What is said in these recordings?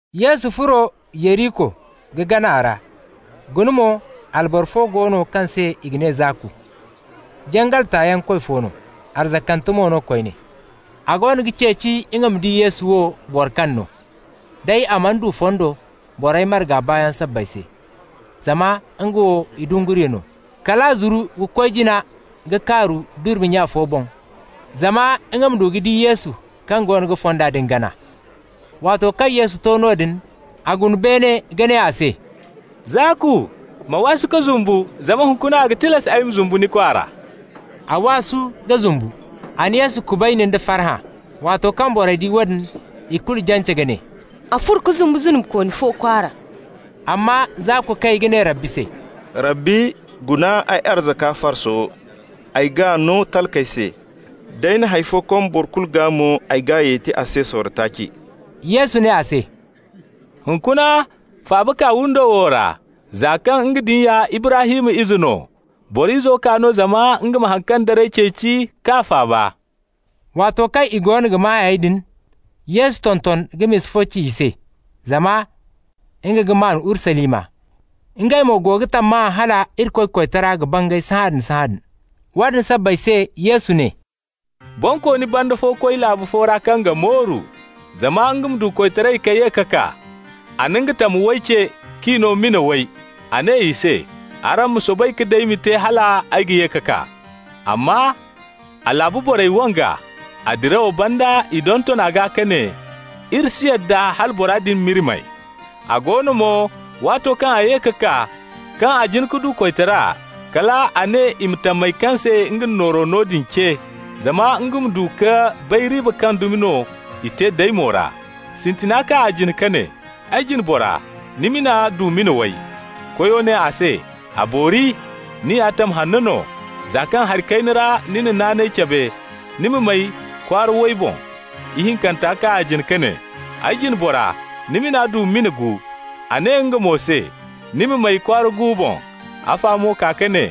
Yesu furo Yeriko ka gana a ra. Guna mo, alboro fo go no kaŋ se i ga ne Zaaku. Jangal tayaŋ koy fo no, arzakante mo no koyne. A goono ga ceeci nga ma di Yesu wo, boro kaŋ no. Day a mana du fondo borey marga baayaŋ sabbay se, zama nga wo idunguriyo no. Kal a zuru ka koy jina ka kaaru durmi nya fo boŋ, zama nga ma du ka di Yesu kaŋ goono ga fonda din gana. Waato kaŋ Yesu to noodin, a guna beene ka ne a se: «Zaaku, ma waasu ka zumbu, zama hunkuna a ga tilas ay ma zumbu ni kwaara.» A waasu ka zumbu. A na Yesu kubayni nda farhã. Waato kaŋ borey di woodin, i kulu jance ka ne: «A furo ka zumbu zunubikooni fo kwaara.» Amma Zaaku kay ka ne Rabbi se: «Rabbi, guna, ay arzaka farso, ay g'a no talkey se. D'ay na hay fo kom boro kulu gaa mo, ay g'a yeti a se sorro taaci.» Yesu ne a se: «Hunkuna faaba kaa windo wo ra, za kaŋ nga din ya Ibrahim ize no. Boro Izo kaa no zama nga ma haŋ kaŋ daray ceeci k'a faaba.» Waato kaŋ i goono ga maa hayey din, Yesu tonton ka misa fo ci i se, zama nga ga maan Urusalima, ngey mo go ga tammahã hala Irikoy koytara ga bangay sahãadin-sahãadin. Woodin sabbay se Yesu ne: «Bonkooni banda fo koy laabu fo ra kaŋ ga mooru, zama nga ma du koytaray ka ye ka kaa. A na nga tam way ce, k'i no mina way. A ne i se: ‹Araŋ ma soobay ka daymi te hal ay ga ye ka kaa.› Amma a laabu borey wang'a. A dirawo banda i donton a gaa ka ne: ‹Iri si yadda hala bora din m'iri may.› A go no mo, waato kaŋ a ye ka kaa, kaŋ a jin ka du koytara, kal a ne i ma tamey kaŋ se nga na nooro no din ce, zama nga ma du ka bay riiba kaŋ dumi no i te daymo ra. Sintina kaa a jine ka ne: ‹Ay jine bora, ni mina du mina way.› Koyo ne a se: ‹A boori! Ni ya tam hanno no! Za kaŋ hari kayna ra ni na naanay cabe, ni ma may kwaara way boŋ.› Ihinkanta kaa a jine ka ne: ‹Ay jine bora, ni mina du mina gu.› A ne nga mo se: ‹Ni ma may kwaara gu boŋ.› Afa mo kaa ka ne: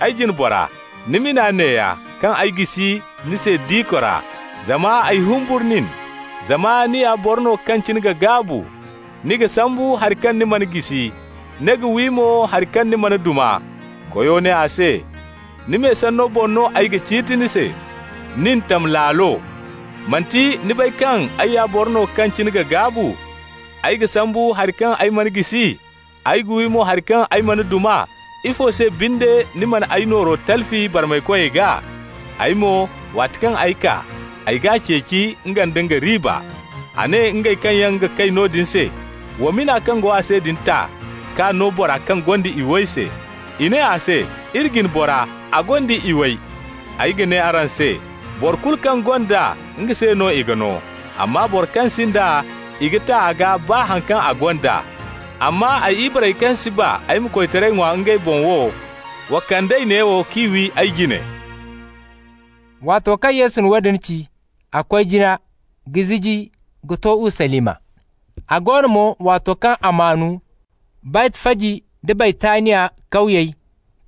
‹Ay jine bora, ni mina neeya, kaŋ ay jisi ni se diko ra. Zama ay humburu nin, zama ni ya boro no kaŋ cine ga gaabu. Ni ga sambu hari kaŋ ni mana jisi, ni ga wi mo hari kaŋ ni mana duma.› Koyo ne a se: ‹Ni me sanno boŋ no ay ga ciiti ni se, nin, tam laalo! Manti ni bay kaŋ ay ya boro no kaŋ cine ga gaabu? Ay ga sambu hari kaŋ ay mana jisi, ay ga wi mo hari kaŋ ay mana duma. Ifo se binde ni mana ay nooro talfi barmaykoy gaa? Ay mo, waati kaŋ ay kaa, ay g'a ceeci, nga nda nga riiba.› A ne ngey kaŋ yaŋ ga kay noodin se: ‹Wa mina kaŋ go a se din ta k'a no bora kaŋ gonda iway se.› I ne a se: ‹Iri jine bora, a gonda iway.› Ay ga ne araŋ se: ‹Boro kulu kaŋ gonda, nga se no i ga no. Amma boro kaŋ sinda, i ga ta a gaa baa haŋ kaŋ a gonda. Amma ay ibarey kaŋ si ba ay ma koytaray ŋwa ngey boŋ wo, wa kand'ey neewo k'i wi ay jine.›» Waato kaŋ Yesu na woodin ci, a koy jina ka ziji ka to Urusalima. A go no mo, waato kaŋ a maan Baytfaji nda Baytaniya kawyey,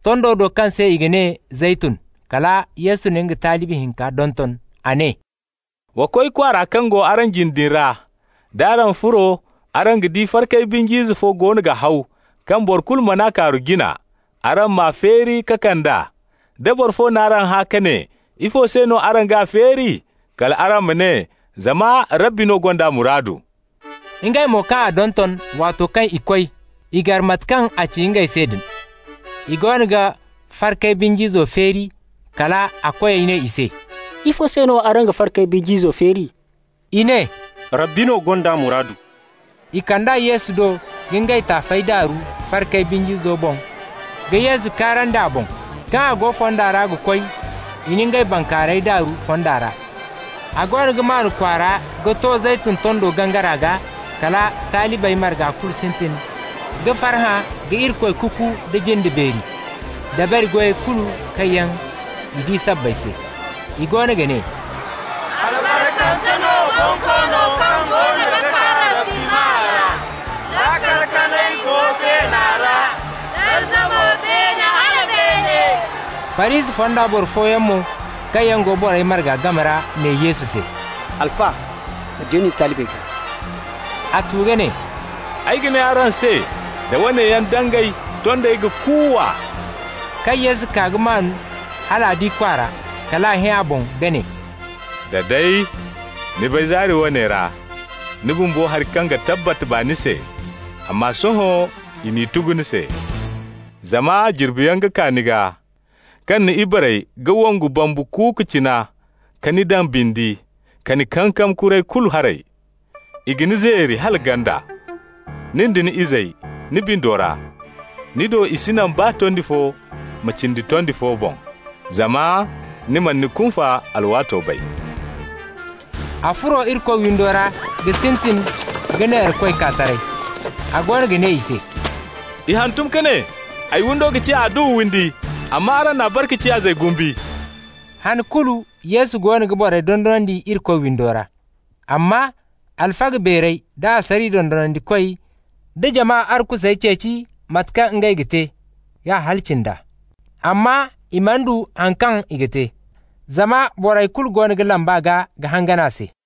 tondo do kaŋ se i ga ne Zeytun, kala Yesu na nga talibi hinka donton. A ne: «Wa koy kwaara kaŋ go araŋ jine din ra. D'araŋ furo, araŋ ga di farkay binj'ize fo goono ga haw, kaŋ boro kulu man'a kaaru jina. Araŋ m'a feeri ka kand'a. Da boro fo n'araŋ hã ka ne: ‹Ifo se no araŋ g'a feeri?› kal araŋ ma ne: ‹Zama Rabbi no gond'a muraadu.›» Ngey mo kaŋ a donton, waato kaŋ i koy, i gar mate kaŋ a ci ngey se din. I goono ga farkay binj'izo feeri, kal a koyey ne i se: «Ifo se no araŋ ga farkay binj'izo feeri?» I ne: «Rabbi no gond'a muraadu.» I kand'a Yesu do ka ngey taafey daaru farkay binj'izo boŋ ka Yesu kaarandi a boŋ. Kaŋ a go fonda ra ga koy, i na ngey bankaaray daaru fonda ra. A goono ga maan kwaara ka to Zeytun tondo gangara gaa, kala talibey marga kulu sintin ka farhã ka Irikoy kuku nda jinde beeri, dabari goyey kulu kaŋ yaŋ i di sabbay se. I goono ga ne: «Albarkante no Bonkoono kaŋ goono ga kaa Rabbi maa ra!» «Laakal kanay go beena ra, darza mo beene hala beene!» Farisi fonda boro fooyaŋ mo kaŋ go borey marga game ra ne Yesu se: «Alfa, ma deeni ni talibey gaa.» A tu ka ne: «Ay ga ne araŋ se: da woone yaŋ dangay, tondey ga kuuwa.» Kaŋ Yesu kaa ka maan hal a di kwaara, kal a hẽ a boŋ ka ne: «Da day ni bay zaari woone ra, ni bumbo, hari kaŋ ga tabbat baani se! Amma sohõ i n'i tugu ni se. Zama jirbiyaŋ ga kaa ni gaa kaŋ ni ibarey ga wongu bambu kuuku cina ka ni daŋ bindi, ka ni kankam kuray kulu haray. I ga ni zeeri hala ganda, nin da ni izey ni bindo ra. Ni do i si naŋ baa tondi fo ma cindi tondi fo boŋ, zama ni mana ni kunfa alwaato bay.» A furo Irikoy windo ra ka sintin ka neerakoy kaa taray. A goono ga ne i se: «I hantum ka ne: ‹Ay windo ga ciya adduwa windi.› amma araŋ n'a bare ka ciya ‹zayyaŋ guusu›.» Han kulu Yesu goono ga borey dondonandi Irikoy windo ra. Amma alfaga beerey da asariya dondonandikoy da jama arkusey ceeci mate kaŋ ngey ga te k'a halaci nd'a. Amma i mana du haŋ kaŋ i ga te, zama borey kulu go ga lamb'a gaa ka hangan a se.